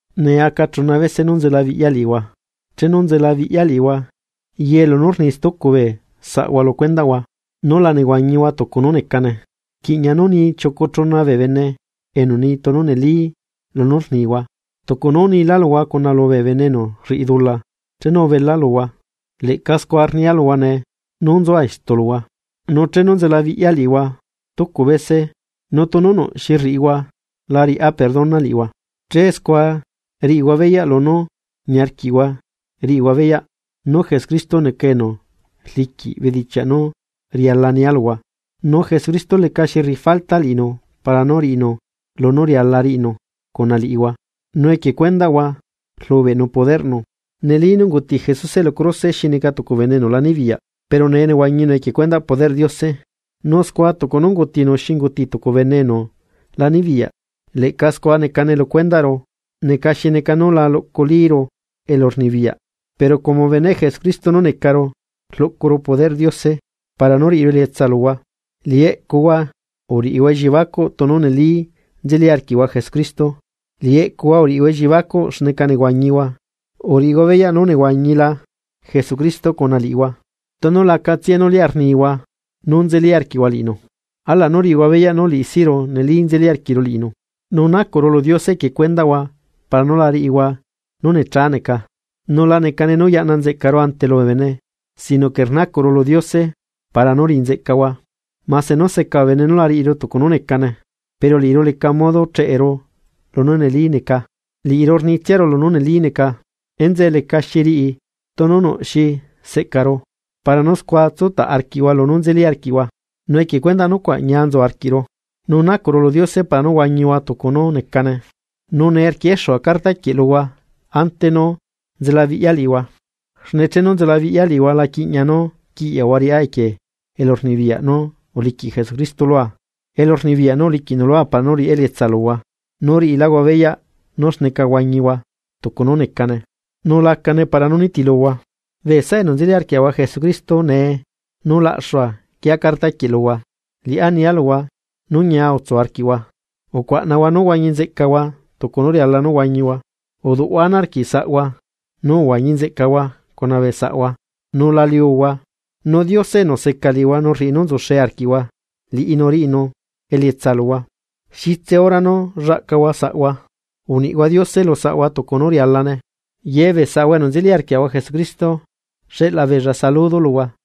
Nee aca chuna vese nú nzelabiꞌya liꞌihua. Chenu nzelabiꞌya liꞌihua, ye lunú rni stucu bee saꞌhua lu cuendaꞌhua, nú la nehuañihua tucu nú necane, rquiꞌña nú ni chiucu chuna bee bene enu ni tunu neli lunú rnihua. Tucu nú unila luhua cuna lubee bene enu rriꞌi dula chenu ubela luhua, leꞌca scua rnia luhua nee nú nzua istu luhua, nu chenu nzelabiꞌya liꞌihua stucu bese nu tunu nuꞌ xi rriꞌihua la riꞌá perdona liꞌihua. Che scua riꞌihua beyaꞌ lunú niarquiꞌhua riꞌihua beyaꞌ nú Jesucristo neca enu rliquiꞌ bedichiaꞌ nú riala nia luhua. Nu Jesucristo lecaxi rriꞌi falta liꞌinu para nú riꞌinu lunú riala riꞌinu cuna liꞌihua nu equie cuendaꞌhua rlubeꞌnu poderꞌnu. Neli nú unguti Jesuse lu cruse xi neca tucu bene enu la nibiyaꞌ, pero nee nehuañinu equie cuendaꞌ poderꞌ Diose. Nu scua tucu nú ungutinu xi unguti tucu bene enu la nibiyaꞌ leꞌca scua necane lu cuendaꞌru neca xi neca nú la luꞌculíru elurnibiyaꞌ, pero como beneꞌ Jesucristo nú necaru rluꞌcuru poderꞌ Diose para nú riꞌiru elietsa luhua. Liꞌi eꞌcuhua uriꞌihua elliebacuꞌ tunu neli nzeli arquiꞌhua Jesucristo, liꞌi eꞌcuhua uriꞌihua elliebacuꞌ xneca nehuañihua, uriꞌihua beyaꞌ nú nehuañila Jesucristo cuna liꞌihua, tunu lacatsiae nú lia rnihua nú nzeli arquiꞌhua liꞌinu. Alaꞌ nú riꞌihua beyaꞌ nú liꞌisiꞌru neli nzeli arquiꞌru liꞌinu. Nu nacuꞌru lu Diose equie cuendaꞌhua para nú la riꞌihua nú necha neca, nu la necane nú yaꞌna nzeꞌcaru ante lubee bene sino que rnacuꞌru lu Diose para nú riꞌi nzeꞌcahua, mase nú seca bee bene nú la riꞌiru tucu nú necane. Pero liꞌiru leca modo cheꞌeru lunú neli neca, liꞌiru rnitsiaru lunú neli neca. Enzeꞌe lecaxi riꞌi tunu nuꞌ xi seꞌcaru para nú scua tsutaꞌ arquiꞌhua lunú nzeli arquiꞌhua, nu equie cuendaꞌ nucuaꞌ ñia nzu arquiꞌru, nu nacuꞌru lu Diose para nú huañihua tucu nú necane. Nu nee rquieꞌexua carta quieꞌ luhua ante nú nzelabiꞌya liꞌihua, xne chenu nzelabiꞌya liꞌihua la quiꞌña nú quiꞌyaꞌhua riꞌá equie elurnibiyaꞌ nú uliquiꞌ Jesucristo lua elurnibiyaꞌ nú uliquiꞌnu lua para nú riꞌá elietsa luhua nú riꞌiláhua beyaꞌ nú xneca huañihua tucu nú necane, nu lacane para nú nitiluhua. Bee saꞌa enu nzeli arquiaꞌahua Jesucristo nee nú laꞌxua quieꞌa carta quieꞌ luhua, liꞌá nia luhua: Nú ñia tsu arquiꞌhua, ucuaꞌnahua nú huañinzeꞌcahua tucu nú riala nú huañihua, uduꞌhua ana arquiꞌ saꞌhua nu uhuañi nzeꞌcahua cuna bee saꞌhua nu la liuhua, nu Diose enu seca liꞌihua nu rriꞌi nú nzuxe arquiꞌhua liꞌinu riꞌinu elietsa luhua. Xitse hora nú llaꞌcahua saꞌhua, uniꞌhua Diose lu saꞌhua tucu nú rialane. Ye bee saꞌahua enu nzeli arquiaꞌahua Jesucristo xeꞌla beella saludo luhua.